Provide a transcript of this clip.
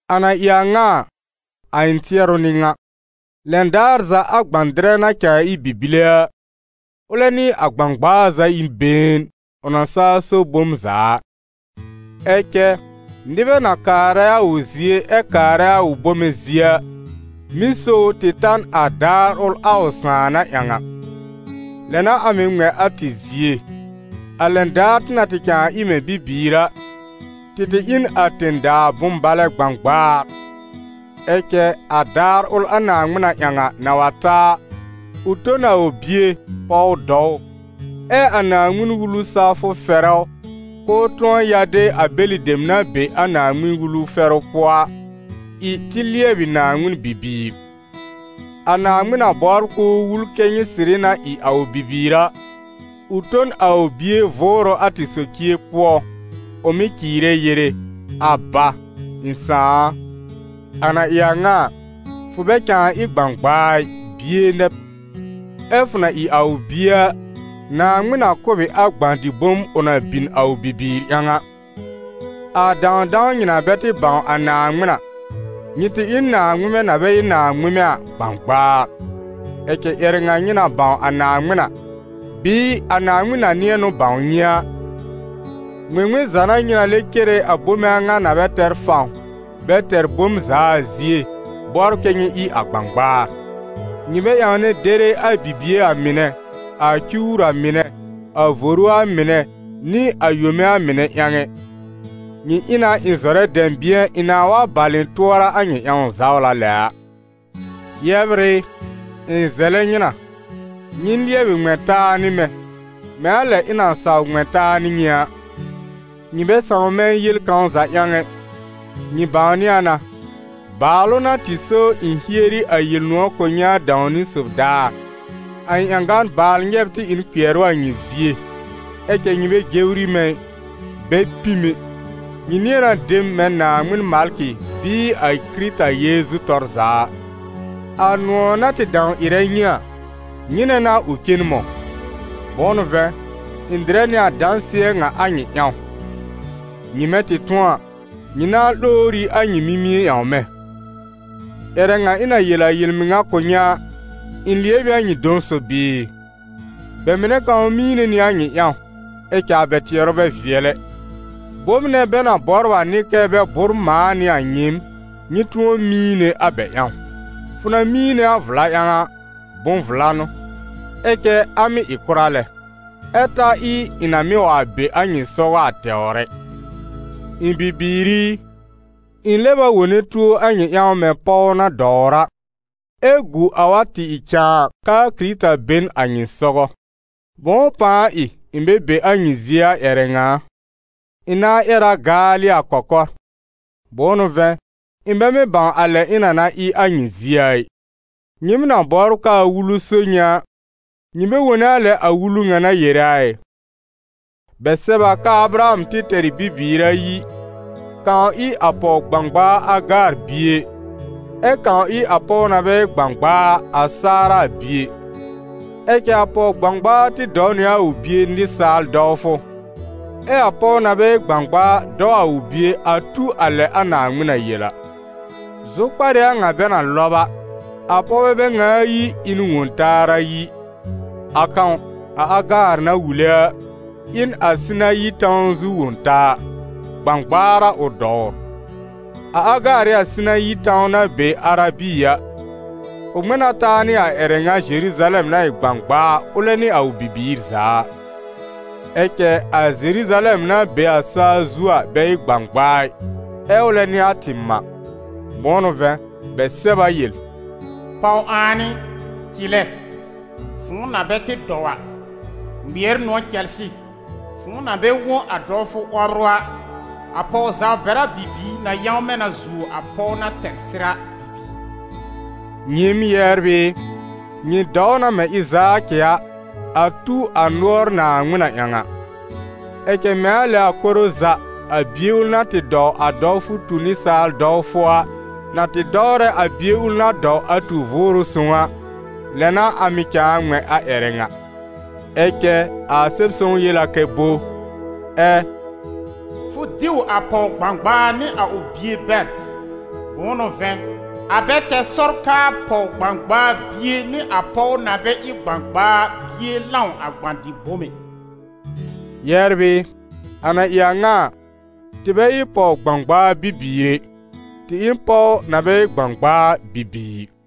A na ɩ a ŋa a, a ɩ̃ tɩɛrʋ n'ɩ ŋa: lɛn daar za a gbã-dɩrɛ na cãa ɩ bibile a, ʋlɛ nɩ a gbãgbaa za ɩ n been, ʋ na saa so bom za a. Ɛ cɛ nɩbɛ na kaarɛ a ʋ zie ɛ kaarɛ a ʋ bome zie a, mɩ́ so ʋ tɩ ta n a daar ʋl a ʋ sãà na ƴãw a. Lɛ n'a a mɩ̀ ŋmɛ̃ a tɩ zie, a lɛn daar tɩ na tɩ cãa ɩ mɛ̃ bibiir a, tɩ tɩ ɩ n a tẽ-daa bʋ̃-balɛ gbãgbaar. Ɛ cɛ a daar ʋl, a Naaŋmɩn na ƴãw a, na wa ta a, ʋ to n a ʋ Bie, pɔw dɔw ʋ, ɛ a Naaŋmɩn-Wulu sawfʋ fɛrɛ ʋ, k'ʋʋ tʋ̃ɔ ya de a bɛlɩ dem na be a Naaŋmɩn-Wulu fɛrʋ pʋɔ a, ɩ tɩ lɩɛbɩ Naaŋmɩn bibiir. A Naaŋmɩn na bɔbr k'ʋʋ wul kɛ́ nyɩ sɩrɩ na ɩ a ʋ bibiir a, ʋ to n a ʋ Bie Vʋʋrʋ a tɩ socie pʋɔ, ʋ mɩ́ cɩɩrɛ yere: «Aba, ɩ̃ Sãà a!» A na ɩ a ŋa a, fʋ bɛ cãa ɩ gbãgbaa ɩ, bie nɛ b; ɛ fʋ na ɩ a ʋ bie a, Naaŋmɩn na kʋ̀ b ɩ a gbã-dɩ-bom ʋ na bin a ʋ bibiir ƴãw a. A dãwdãw nyɩ na bɛ tɩ bãw a Naaŋmɩn a, nyɩ tɩ ɩ n naaŋmɩmɛ na bɛ ɩ naaŋmɩmɛ a gbãgbaar. Ɛ cɛ ƴɛrɛ ŋa nyɩ na bãw a Naaŋmɩn a, bɩɩ a Naaŋmɩn na nɩ̃ɛ n'ʋ bãw nyɩ a, ŋmɩŋmɩn za n'a nyɩ lɛb cere a bome a ŋa na bɛ tɛr fãw, bɛ tɛr bom za a zie, bɔbr kɛ́ nyɩ ɩ a gbãgbaar? Nyɩ bɛ ƴãwnɛ dere a bibie a mɩnɛ, a cuwr a mɩnɛ, a voru a mɩnɛ, nɩ a yome a mɩnɛ ƴãw ɛ. Nyɩ ɩ na ɩ̃ zɔrɛ dɛ̃bɩ̃ɛ ɩ̃ nãa wa bal ɩ̃ tʋɔra a nyɩ ƴãw zawla lɛ a. Yɛbr ɩ, ɩ̃ zɛlɛ nyɩ na, nyɩ lɩɛbɩ ŋmɛ̃ taa nɩ mɛ̃, mɛ̃ a lɛ ɩ̃ na saw ŋmɛ̃ taa nɩ nyɩ a. Nyɩ bɛ sãw mɛ̃ yel kãw za ƴãw ɛ. Nyɩ bãwnɩ a na, bàalʋ n'a tɩ so ɩ̃ hieri a Yel-nʋ̃ɔ̀ kʋ̀ nyɩ a dãw-niwn sob daar. A ɩ̃ ƴãgan-baal nyɛ́b tɩ ɩ n kpɩɛrʋ a nyɩ zie, ɛ cɛ nyɩ bɛ jewri mɛ̃ ɩ, bɛ pĩ m ɛ; nyɩ nɩ̃ɛ na de m mɛ̃ Naaŋmɩn malkɩ bɩɩ a Kɩrɩta Yeezu tɔr za a. A nʋ̃ɔ̀ na tɩ dãw ɩrɛ nyɩ a, nyɩnɛ n'a ʋ cen mɔ̃? Bʋ̃ʋ n'ʋ vɛ̃, ɩ̃ dɩrɛ nɩ a dãsɩɛ ŋa a nyɩ ƴãw: nyɩmɛ tɩ tʋ̃ɔ a, nyɩ nãa lowr ɩ a nyɩ mimie ƴãw mɛ̃. Ƴɛrɛ ŋa ɩ̃ na yel a yel-mɩŋa kʋ̀ nyɩ a, ɩ̃ lɩɛb ɩ a nyɩ dɔ̃ sob bɩɩ? Bɛ mɩnɛ kãw miine nɩ a nyɩ ƴãw, ɛ cɛ a bɛ tɩɛrʋ bɛ vɩɛl ɛ. Bom nɛ bɛ na bɔbr a n'ɩ kɛ bɛ bʋ́r mãa nɩ a nyɩɩm, nyɩ tʋ̃ɔ miine a bɛ ƴãw. Fʋ na miine a vla ƴãw a, bʋ̃-vla n'ʋ, ɛ cɛ a mɩ́ ɩ kʋra lɛ, ɛ ta ɩ ɩ̃ na mɩ́ wa be a nyɩ sɔgɔ a tɛwr ɛ. Ɩ̃ bibiir i, ɩ̃ lɛb a wone tuo a nyɩ ƴãw mɛ̃ pɔw na dɔwr a, ɛ gu a wa tɩ ɩ cãa k'aa Kɩrɩta be n a nyɩ sɔgɔ. Bʋ̃ʋ pãa ɩ ɩ̃ bɛ be a nyɩ zie a ƴɛrɛ ŋa a! Ɩ̃ nãa ƴɛr a gaalɩ a kɔkɔr. Bʋ̃ʋ n'ʋ vɛ̃, ɩ̃ bɛ mɩ́ bãw a lɛ ɩ̃ na na ɩ a nyɩ zie a ɩ. Nyɩɩm na bɔbr k'aa Wulu so nyɩ a, nyɩ bɛ wone a lɛ a Wulu ŋa na yere a ɩ? Bɛ sɛb a k'aa Abraham tɩ tɛr ɩ bibiir ayi, kãw ɩ a pɔw-gbãgbaa Agaar bie, ɛ kãw ɩ a pɔw na bɛ ɩ gbãgbaa a, a Saara bie. Ɛ cɛ a pɔw-gbãgbaa tɩ dɔw nɩ a ʋ bie nɩsaal dɔwfʋ, ɛ a pɔw na bɛ ɩ gbãgbaa a dɔw a ʋ bie a tu a lɛ a Naaŋmɩn na yel a. Zʋkpar ɩ a ŋa bɛ na lɔb a: a pɔwbɛ bɛ ŋa ayi ɩ n wõ-taar ayi: a kãw, a Agaar na wule a, ɩ n a Sinayi tãw zu wõ-taa; gbãgbaar a ʋ dɔwr. A Agaar ɩ a Sinayi tãw na be Arabi a, ʋ ŋmɛ̃ na taa nɩ a ƴɛrɛ ŋa Zeruzalɛm na ɩ gbãgbaa, ʋlɛ nɩ a ʋ bibiir za a. Ɛ cɛ a Zeruzalɛm na be a saa zu a bɛ ɩ gbãgbaa ɩ, ɛ ʋlɛ n'ɩ a tɩ mã. Bʋ̃ʋ n'ʋ vɛ̃, bɛ sɛb a yel: «Pɔw-ãan ɩ, cɩlɛ, fʋ̃ʋ na bɛ tɩ dɔw a, ŋmɩɛr nʋ̃ɔ̀ cɛlsɩ, fʋ̃ʋ na bɛ wõ a dɔwfʋ 'wɔbrʋ a; a pɔw-zaw-bɛra bibiir na yãwmɛ̃ na zuo a pɔw na tɛr sɩr a bibiir.» Nyɩɩm, yɛbr ɩ, nyɩ dɔw na mɛ̃ Ɩzaakɩ a, a tu a nʋɔr Naaŋmɩn na ƴãw a. Ɛ cɛ mɛ̃ a lɛ a koro za, a bie ʋl na tɩ dɔw a dɔwfʋ tu nɩsaal dɔwfʋ a, na tɩ dɔwrɛ a bie ʋl na dɔw a tu Vʋʋrʋ Sõw a, lɛ n'a a mɩ̀ cãa ŋmɛ̃ a ƴɛrɛ ŋa. Ɛ cɛ a Sɛb-sõw yel a kɛ bo? Ɛ «Fʋ diw a pɔw-gbãgbaa nɩ a ʋ bie bɛr; bʋ̃ʋ n'ʋ vɛ̃, a bɛ tɛr sɔr k'aa pɔw-gbãgbaa bie nɩ a pɔw na bɛ ɩ gbãgbaa a bie lãw a gbã-dɩ-bom ɛ.» Yɛbr ɩ, a na ɩ a ŋa a, tɩ bɛ ɩ pɔw gbãgbaa bibiir ɛ, tɩ ɩ n pɔw na bɛ ɩ gbãgbaa a bibiir.